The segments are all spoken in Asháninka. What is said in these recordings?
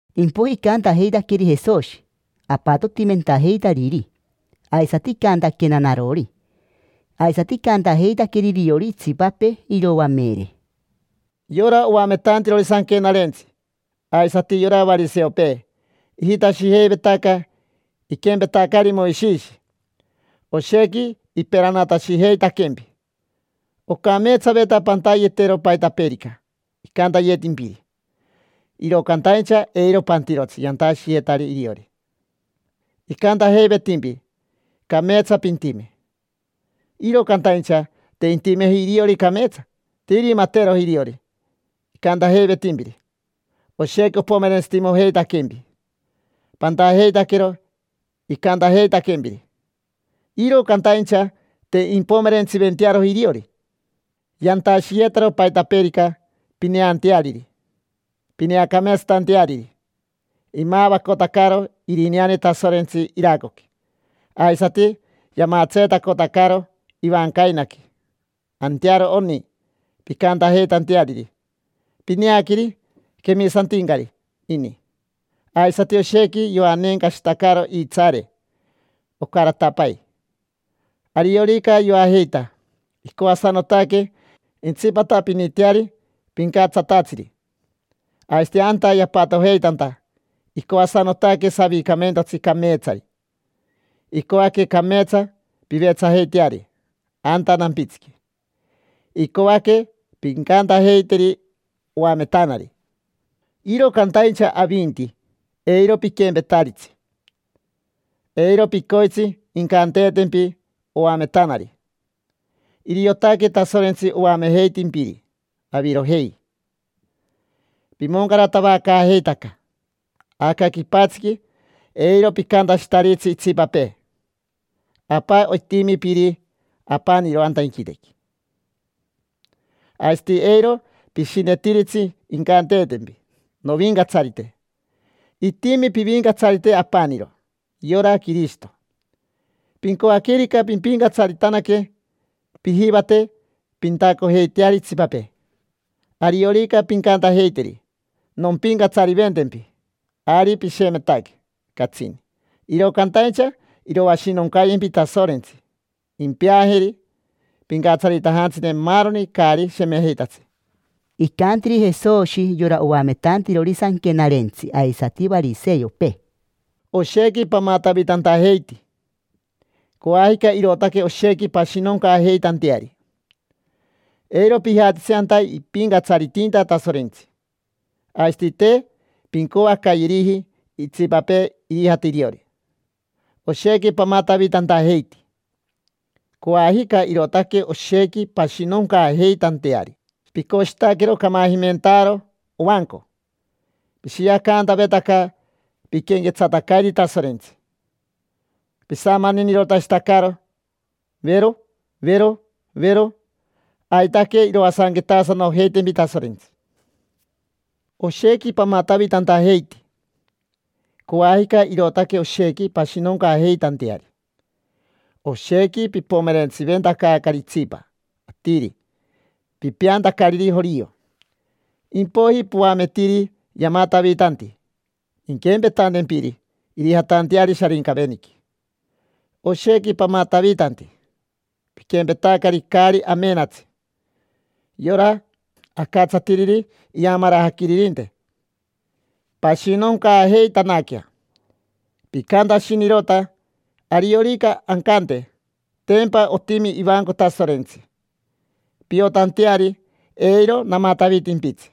Impoiji icantajeitaqueri Jesoshi apatotimentajeitariri, aisati icantaquena narori, aisati icantajeitaqueri iriori itsipapee iroamere: —Yora oametantirori Sanquenarentsi aisati yora variseopee ijitashijeivetaca iquempetacari Moishishi: oshequi iperanatashijeitaquempi. Ocameetsaveta pantayetero paitapeerica icantayetimpiri, iro cantaincha eiro pantirotsi yantashiyetari iriori. Icantajeivetimpi: “Cameetsa pintime”, iro cantaincha te intimeji iriori cameetsa. Te irimateroji iriori icantajeivetimpiri. Oshequi opomerentsitimojeitaquempi pantajeitaquero icantajeitaquempiri, iro cantaincha te impomerentsiventearoji iriori. Yantashiyetaro paitapeerica pineanteariri, pineacameetsatanteariri. Imavacotacaro irineane Tasorentsi iracoqui aisati yamatseetacotacaro ivancainaqui; antearo oni, pincantajeitanteariri: “Pineaqueri, quemisantincari ini”. Aisati oshequi yoanencashitacaro iitsaare ocaratapai. Ariorica yoajeita, icoasanotaque intsipatapiniteari pincatsatatsiri. Aisati anta yapatojeitanta icoasanotaque savicamentotsi cameetsari. Icoaque cameetsa pivetsajeiteari anta nampitsiqui, icoaque pincantajeiteri: “Oametanari”. Iro cantaincha avinti, eiro piquempetaritsi: eiro picoitsi incanteetempi: “Oametanari”. Iriotaque Tasorentsi oamejeitimpiri; avirojei, pimoncaratavacaajeitaca. Aca quipatsiqui eiro picantashitaritsi itsipapee: “Apa”. Itimi Piri apaniro anta inquitequi. Aisati eiro pishinetiritsi incanteetempi: “Novincatsarite”. Itimi pivincatsarite apaniro, yora Quirishito. Pincoaquerica pimpincatsaritanaque, pijivate pintacojeiteari itsipapee. Ariorica pincantajeiteri: “Nompincatsariventempi”, ari pishemetaque catsini, iro cantaincha iroashinoncayempi Tasorentsi. Impeajeri pincatsaritajantsine maaroni caari shemejeitatsi. Icantiri Jesoshi yora oametantirori Sanquenarentsi aisati variseopee: —Oshequi pamatavitantajeiti, coajica irootaque oshequi pashinoncaajeitanteari. Eiro pijatitsi anta ipincatsaritinta Tasorentsi, aisati te pincoacayeriji itsipapee irijate iriori. Oshequi pamatavitantajeiti, coajica irootaque oshequi pashinoncaajeitanteari. Picoshitaquero camajimentaaro ovanco; pishiacantavetaca piquenquetsatacairi Tasorentsi, pisamaninirotashitacaro, vero, vero, vero. Aitaque iroasanquetasanojeitempi Tasorentsi. Oshequi pamatavitantajeiti, coajica irootaque oshequi pashinoncaajeitanteari. Oshequi pipomerentsiventacaacari itsipa atiri pipeantacariri jorio. Impoiji poametiri yamatavitanti, inquempetantempiri irijatanteari Sharincaveniqui. Oshequi pamatavitanti: piquempetacari caari amenatsi yora acatsatiriri iyamarajaquiririnte. Pashinoncaajeitanaquea. Picantashinirota: “Ariorica ancante: ‘Tempa otimi ivanco Tasorentsi, piotanteari eiro namatavitimpitsi’,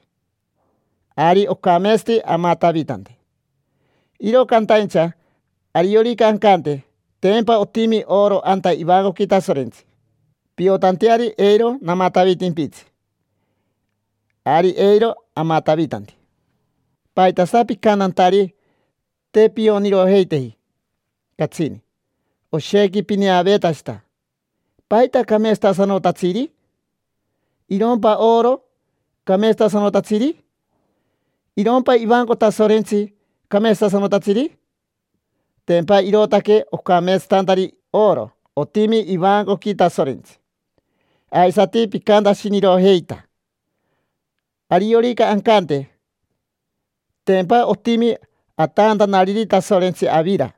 ari ocameetsati amatavitante. Iro cantaincha ariorica ancante: ‘Tempa otimi oro anta ivancoqui Tasorentsi, piotanteari eiro namatavitimpitsi’, ari eiro amatavitanti”. ¿Paitasa picantantari? Te pionirojeiteji catsini. Oshequi pineaveetashita. ¿Paita cameetsatasanotatsiri? ¿Irompa oro cameetsatasanotatsiri? ¿Irompa ivanco Tasorentsi cameetsatasanotatsiri? Tempa irootaque ocameetsatantari oro otimi ivancoqui Tasorentsi. Aisati picantashinirojeita: “Ariorica ancante: ‘Tempa otimi atantanariri Tasorentsi avira,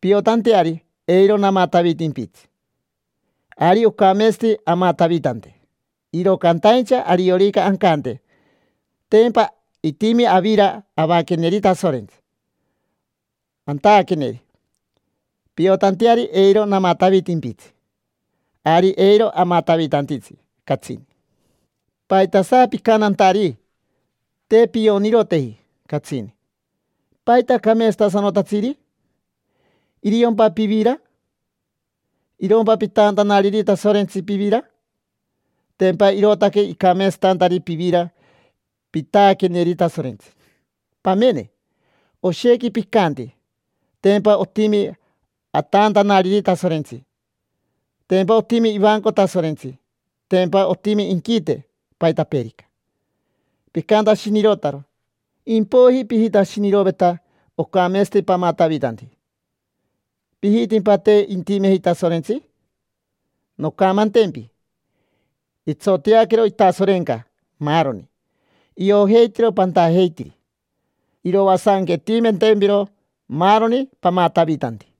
piotanteari eiro namatavitimpitsi’, ari ocameetsati amatavitante. Iro cantaincha ariorica ancante: ‘Tempa itimi avira avaqueneri Tasorentsi, antaaqueneri, piotanteari eiro namatavitimpitsi’, ari eiro amatavitantitsi catsini”. ¿Paitasa picantantari? Te pionirojeiteji catsini. ¿Paita cameetsatasanotatsiri? ¿Iriompa pivira? ¿Irompa pitaantanariri Tasorentsi pivira? Tempa irootaque icameetsatantari pivira pitaaqueneri Tasorentsi. Pamene, oshequi picanti: “Tempa otimi ataantanariri Tasorentsi”, “Tempa otimi ivanco Tasorentsi”, “Tempa otimi inquite”, paitapeerica. Picantashinirotaro, impoiji pijitashiniroveta ocameetsati pamatavitanti. ¿Pijitimpa te intimeji Tasorentsi? Noncamantempi: itsoteaquero itasorenca maaroni. Iojeitiro pantajeitiri, iroasanquetimentempiro maaroni pamatavitanti.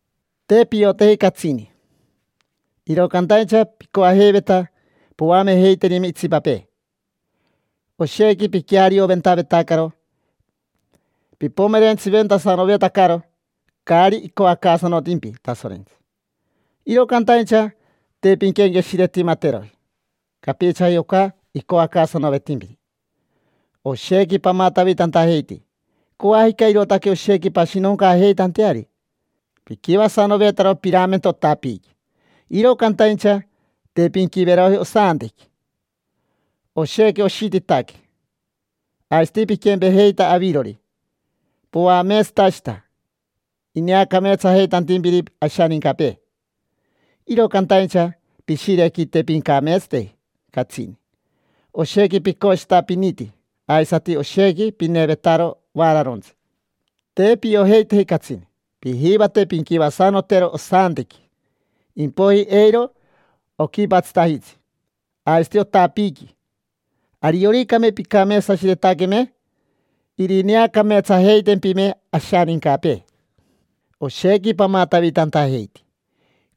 —Te pioteji catsini, iro cantaincha picoajeiveta poamejeiterime itsipapee. Oshequi piquearioventavetacaro pipomerentsiventasanovetacaro caari icoacaasanotimpi Tasorentsi; iro cantaincha te pinquenqueshiretimateroji capichaji oca icoacaasanovetimpiri. Oshequi pamatavitantajeiti, coajica irootaque oshequi pashinoncaajeitanteari. Piquivasanovetaro piramento otapiiqui, iro cantaincha te pinquiveroji osantequi: oshequi oshititaque. Aisati piquempejeita avirori, poameetsantashita ineacameetsajeitantimpiri ashanincapee, iro cantaincha pishirequi te pincameetsateji catsini: oshequi picoshitapiniti aisati oshequi pinevetaro vaararontsi. Te piojeiteji catsini. Pijivate pinquivasanotero osantequi, impoiji eiro oquipatsitajitsi aisati otapiiqui. Arioricame pincameetsashiretaqueme, irineacameetsajeitempime ashanincapee. Oshequi pamatavitantajeiti,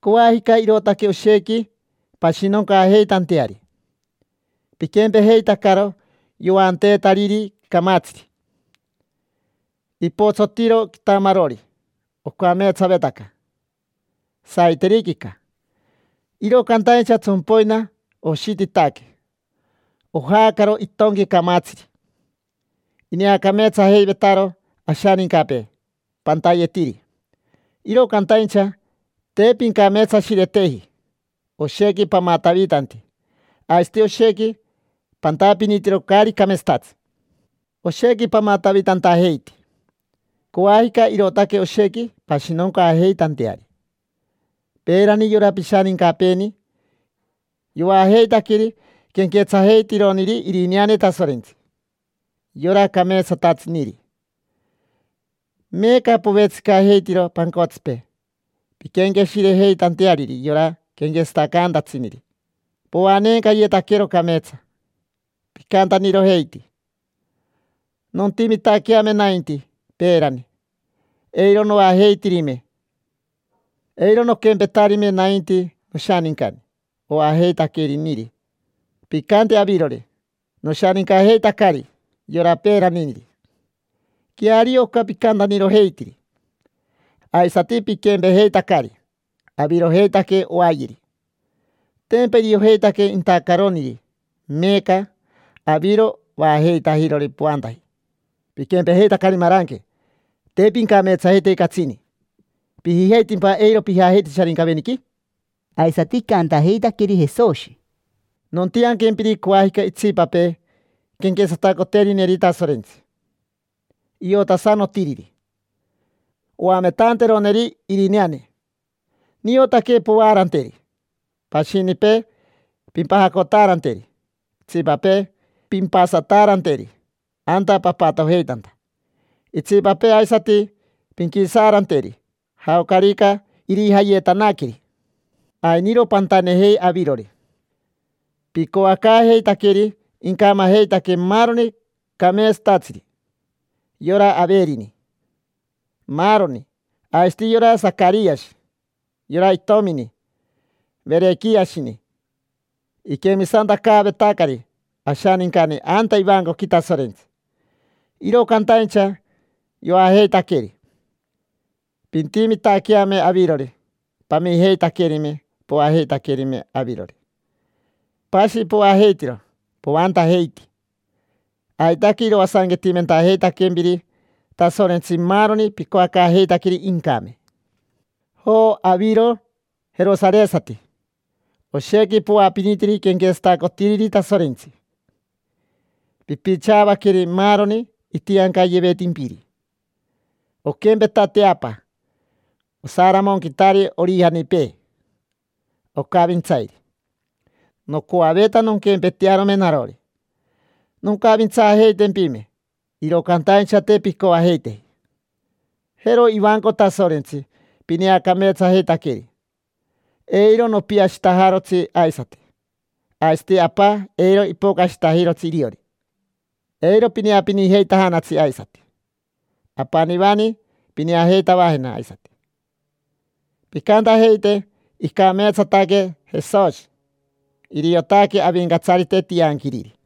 coajica irootaque oshequi pashinoncaajeitanteari. Piquempejeitacaro yoanteetariri camatsiri, ipotsotiro quitamarori. Ocameetsavetaca saiteriquica, iro cantaincha tsompoina oshititaque, ojaacaro itonqui camatsiri. Ineacameetsajeivetaro ashanincapee pantayetiri, iro cantaincha te pincameetsashireteji: oshequi pamatavitanti aisati oshequi pantapinitiro caari cameetsatatsi. Oshequi pamatavitantajeiti, coajica irootaque oshequi pashinoncaajeitanteari. Peerani yora pishanincapeeni yoajeitaqueri quenquetsajeitironiri irineane Tasorentsi, yora cameetsatatsiniri. Meeca povetsicajeitiro pancotsipee pinquenqueshirejeitanteariri yora quenquetsatacantatsiniri. Poanencayetaquero cameetsa. Picantanirojeiti: “Nontimitaqueame nainti peerani, eiro noajeitirime, eiro noquempetarime nainti noshanincani oajeitaqueriniri”. Picanti avirori: “Noshanincajeitacari yora peeraniniri”. Queario oca picantanirojeitiri. Aisati piquempejeitacari, avirojeitaque oayeri. Tempa iriojeitaque intacaroniri, meeca aviro vaajeitajirori poantaji. Piquempejeitacari maranque, te pincameetsajeiteji catsini. ¿Pijijeitimpa eiro pijajeititsi Sharincaveniqui? Aisati icantajeitaqueri Jesoshi: —Nontianquempiri coajica itsipapee quenquetsatacoterineri Tasorentsi, iotasanotiriri, oametanteroneri irineane. Niotaque povaaranteri, pashinipee pimpajacotaaranteri, itsipapee pimpasanataaranteri anta papatojeitanta, itsipapee aisati pinquisaaranteri jaocarica irijayetanaqueri. Ainiro pantanejei avirori, picoacaajeitaqueri incamajeitaque maaroni cameetsatatsiri: yora Averini, maaroni. Aisati yora Sacariashi, yora itomini Verequiashini: iquemisantacaavetacari ashanincani anta ivancoqui Tasorentsi, iro cantaincha yoajeitaqueri. Pintimitaqueame avirori, pamijeitaquerime poajeitaquerime avirori. Pashi poajeitiro poantajeiti. Aitaque iroasanquetimentajeitaquempiri Tasorentsi maaroni picoacaajeitaqueri incame. Jo, aviro jerosaresati. Oshequi poapinitiri quenquetsatacotiriri Tasorentsi, pipichaavaqueri maaroni itiancayevetimpiri. Oquempeta teapa osaramonquitari orijanipee, ocavintsairi, nocoaveta nonquempetearome narori, noncavintsaajeitempime. Iro cantaincha te pincoajeiteji. Jero ivanco Tasorentsi pineacameetsajeitaqueri: eiro nopiashitajarotsi aisati. Aisati Apa, eiro ipocashitajirotsi iriori. Eiro pineapinijeitajanatsi aisati. Apanivani pineajeitavajena aisati, pincantajeite: “Icameetsataque Jesoshi, iriotaque Avincatsarite tianquiriri”.